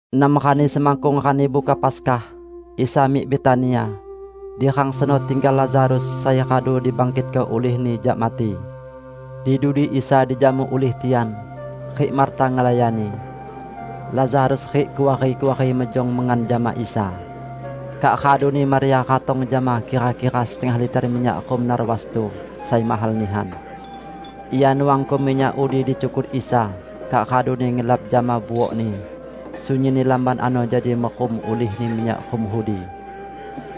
Enam rani semakkung Rani Buka Paskah, Isa mik Betania. Di rang seno tinggal Lazarus sai radu dibangkitko ulih-Ni jak mati. Di dudi Isa dijamu ulih tian, rik Marta ngelayani. Lazarus rik kuari-kuari mejong mengan jama Isa. Kak raduni Maria ratong jama kira-kira setengah liter minyak rum narwastu sai mahal nihan. Ia nuangko minyak udi di cukut Isa, kak raduni ngelap jama buokni. Sunyinni lamban ano jadi merum ulihni minyak rum udi.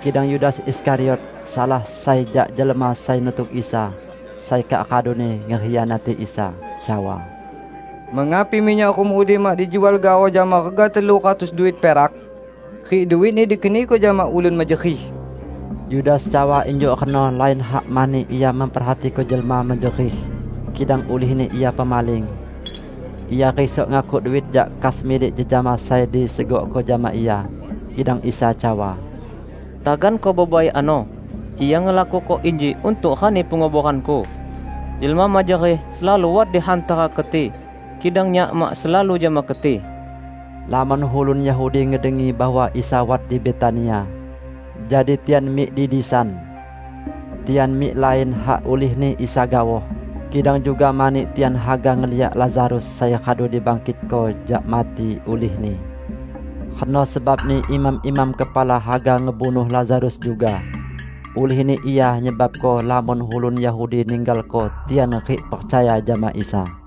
Kidang Yudas Iskariot, salah sai jak jelma sai nutuk Isa -- sai kak raduni ngekhianati Isa -- cawa, "Mengapi minyak rum udi mak dijual gaoh jama rega telu ratus duit perak, rik duitni dikeniko jama ulun mejerih?" Yudas cawa injuk reno lain hak mani ia memperhatiko jelma mejerih, kidang ulihni ia pemaling. Ia risok ngakuk duit jak kas milik jejama sai disegokko jama ia. Kidang Isa cawa, "Taganko bebai ano! Ia ngelakuko inji untuk rani penguboran-Ku. Jelma mejerih selalu wat di hantara keti, kidang Nyak mak selalu jama keti." Lamon ulun Yahudi ngedengi bahwa Isa wat di Betania, jadi tian mik di disan. Tian mik lain hak ulihni Isa gaoh, kidang juga mani tian haga ngeliak Lazarus sai radu dibangkitko jak mati ulih-Ni. Reno sebabni imam-imam kepala haga ngebunuh Lazarus juga; ulihni ia nyebabko lamon ulun Yahudi ninggalko tian rik percaya jama Isa.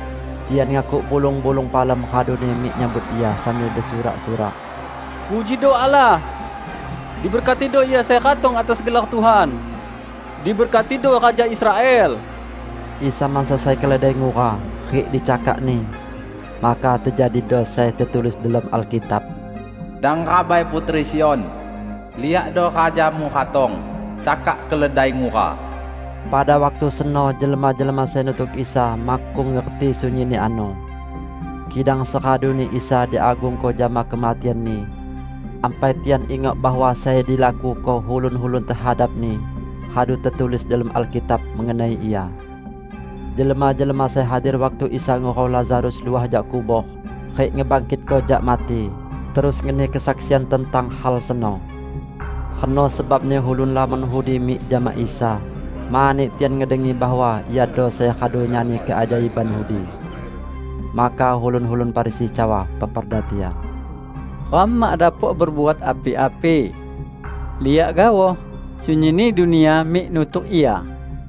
Tian ngakuk bulung-bulung palem raduni mik nyambut Ia, sambil besurak-surak, "Pujido Allah! Diberkatido Ia sai ratong atas gelar Tuhan. Diberkatido Raja Israel!" Isa mansa sai keledai ngura, rik di cakakni. Maka tejadido sai tetulis delom Alkitab: "Dang rabai, putri Sion! Liakdo Rajamu ratong, cakak keledai ngura!" Pada waktu seno jelma-jelma sai nutuk Isa makkung ngerti sunyinni ano. Kidang seraduni Isa diagungko jama kematian-Ni, ampai tian ingok bahwa sai dilakuko ulun-ulun tehadap-Ni radu tetulis delom Alkitab mengenai Ia. Jelma-jelma sai hadir waktu Isa ngurau Lazarus luah jak kubor rik ngebangkitko jak mati, terus ngeni kesaksian tentang hal seno. Reno sebabni ulun lamon udi mik jama Isa mani tian ngedengi bahwa Iado sai radu nyani keajaiban udi. Maka ulun-ulun Farisi cawa peperda tian, "Ram mak dapok bebuat api-api! Liak gaoh, sunyinni dunia mik nutuk Ia!"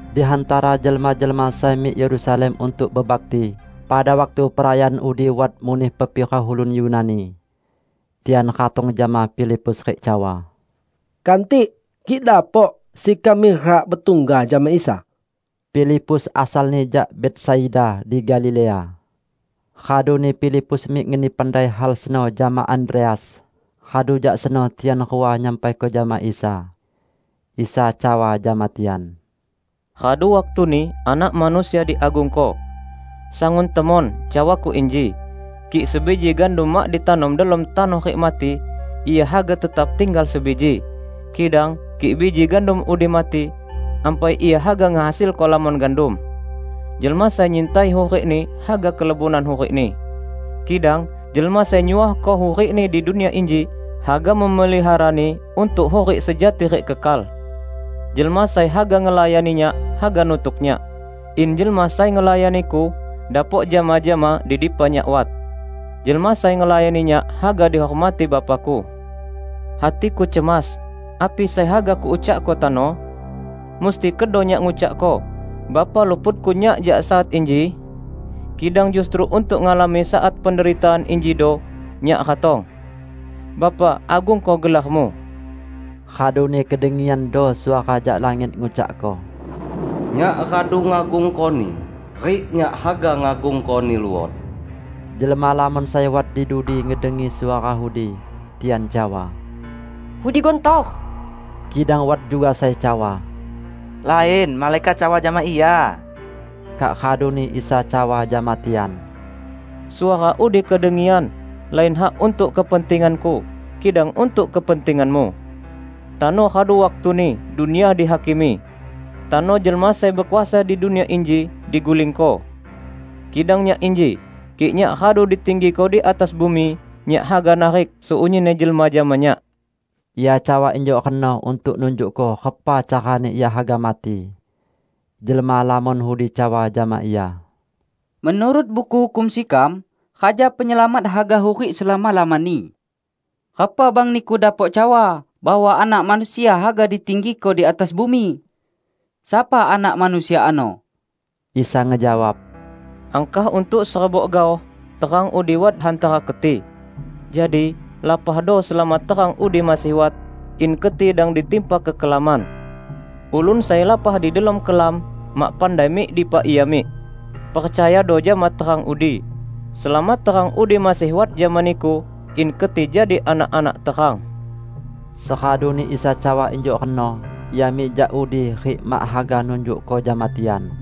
Di hantara jelma-jelma sai mik Yerusalem untuk bebakti pada waktu perayaan udi wat muneh pepira ulun Yunani. Tian ratong jama Filipus rik cawa, "Kantik, kik dapok, sekam mirak betungga jama Isa." (Filipus asalni jak Betsaida di Galilea.) Raduni Filipus mik ngeni pandai hal seno jama Andreas, radu jak seno tian rua nyampaiko jama Isa. Isa cawa jama tian, "Radu waktuni Anak Manusia diagungko. Sangun temon cawa-Ku inji: Kik sebiji gandum mak ditanom delom tanoh rik mati, ia haga tetap tinggal sebiji. Kidang kik biji gandum udi mati, ampai ia haga ngehasilko lamon gandum. Jelma sai nyintai hurikni haga kelebonan hurikni. Kidang jelma sai nyuohko hurikni di dunia inji, haga memeliharani untuk hurik sejati rik kekal. Jelma sai haga ngelayani Nyak haga nutuk Nyak; in jelma sai ngelayani-Ku dapok jama-jama di dipa Nyak wat. Jelma sai ngelayani Nyak haga dihormati Bapa-Ku." "Hati-Ku cemas; api sai haga Kuucakko tano? Musti kedo Nyak ngucakko, 'Bapa luputko Nyak jak saat inji'? Kidang justru untuk ngalami saat penderitaan injido Nyak ratong. Bapa, agungko gelar-Mu!" Raduni kedengiando suara jak langit ngucakko, "Nyak radu ngagungko-Ni, rik Nyak haga ngagungko-Ni luot." Jelma lamon sai wat di dudi ngedengi suara udi. Tian cawa, "Udi guntor!" Kidang wat juga sai cawa, "Lain! Malaikat cawa jama Ia!" Kak raduni Isa cawa jama tian, "Suara udi kedengian, lain hak untuk kepentingan-Ku, kidang untuk kepentinganmu. Tano radu waktuni dunia dihakimi; tano jelma sai bekuasa di dunia inji digulingko. Kidang Nyak inji, kik Nyak radu ditinggiko di atas bumi, Nyak haga narik sunyinni jelma jama Nyak." Ia cawa injuk reno untuk nunjukko repa carani Ia haga mati. Jelma lamon udi cawa jama Ia, "Menurut Buku Hukum sekam, Raja Penyelamat haga hurik selama-lamani. Repa bang Niku dapok cawa bahwa Anak Manusia haga ditinggiko di atas bumi? Sapa Anak Manusia ano?" Isa ngejawab, "Angkah untuk serebok gaoh terang udi wat hantara keti. Jadi, lapahdo selama terang udi masih wat, in keti dang ditimpa kekelaman. Ulun sai lapah di delom kelam mak pandai mik dipa ia mik. Percayado jama terang udi, selama terang udi masih wat jama niku, in keti jadi anak-anak terang." Seraduni Isa cawa injuk reno, Ia mik jak udi rik mak haga nunjukko jama tian.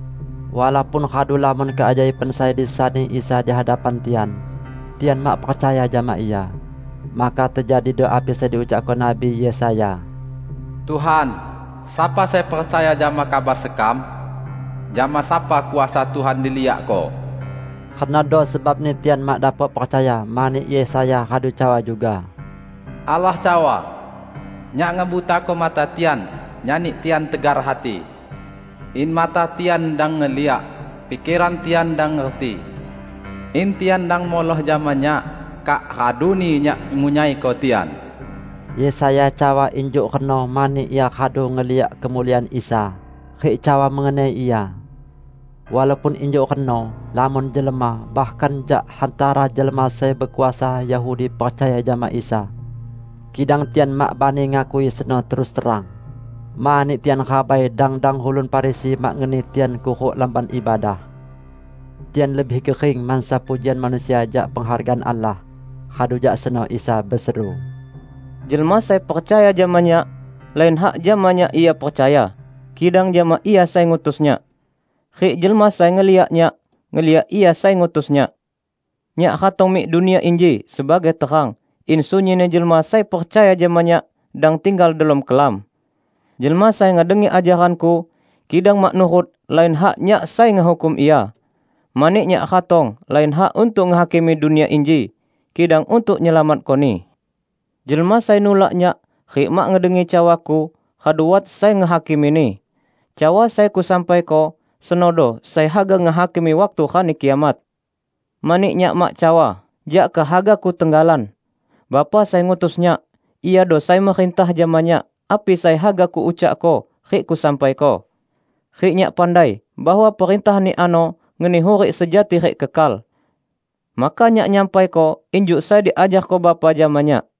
Walaupun radu lamon keajaiban sai disani Isa di hadapan tian, tian mak percaya jama Ia. Maka tejadido api sai diucakko Nabi Yesaya, "Tuhan, sapa sai percaya jama kabar sekam? Jama sapa kuasa Tuhan diliakko?" Renodo sebabni tian mak dapok percaya, mani Yesaya radu cawa juga, "Allah cawa, 'Nyak ngebutako mata tian, nyani tian tegar hati; in mata tian dang ngeliak, pikeran tian dang ngerti. In tian dang muloh jama Nyak, kak raduni Nyak ngunyaiko tian.' " Yesaya cawa injuk reno mani ia radu ngeliak kemuliaan Isa, rik cawa mengenai Ia. Walaupun injuk reno, lamon jelma, bahkan jak hantara jelma sai bekuasa Yahudi percaya jama Isa. Kidang tian mak bani ngakui seno terus terang, mani tian rabai dang-dang ulun Farisi mak ngeni tian kuruk lamban ibadah. Tian lebih gering mansa pujian manusia jak penghargaan Allah. Radu jak seno Isa beseru, "Jelma sai percaya jama Nyak, lain hak jama Nyak ia percaya, kidang jama Ia sai ngutus Nyak. Rik jelma sai ngeliak Nyak, ngeliak Ia sai ngutus Nyak. Nyak ratong mik dunia inji sebagai terang, in sunyinni jelma sai percaya jama Nyak dang tinggal delom kelam. Jelma sai ngedengi ajaran-Ku, kidang mak nurut -- lain hak Nyak sai ngehukum ia. Mani Nyak ratong lain hak untuk ngehakimi dunia inji, kidang untuk nyelamatkoni. Jelma sai nulak Nyak rik mak ngedengi cawa-Ku, radu wat sai ngehakimini. Cawa sai Kusampaiko, senodo sai haga ngehakimi waktu Rani Kiamat. Mani Nyak mak cawa jak kehaga-Ku tenggalan; Bapa sai ngutus Nyak, Iado sai merintah jama Nyak api sai haga Kuucakko rik Kusampaiko. Rik Nyak pandai bahwa perintah-Ni ano ngeni hurik sejati rik kekal. Maka Nyak nyampaiko injuk sai diajarko Bapa jama Nyak."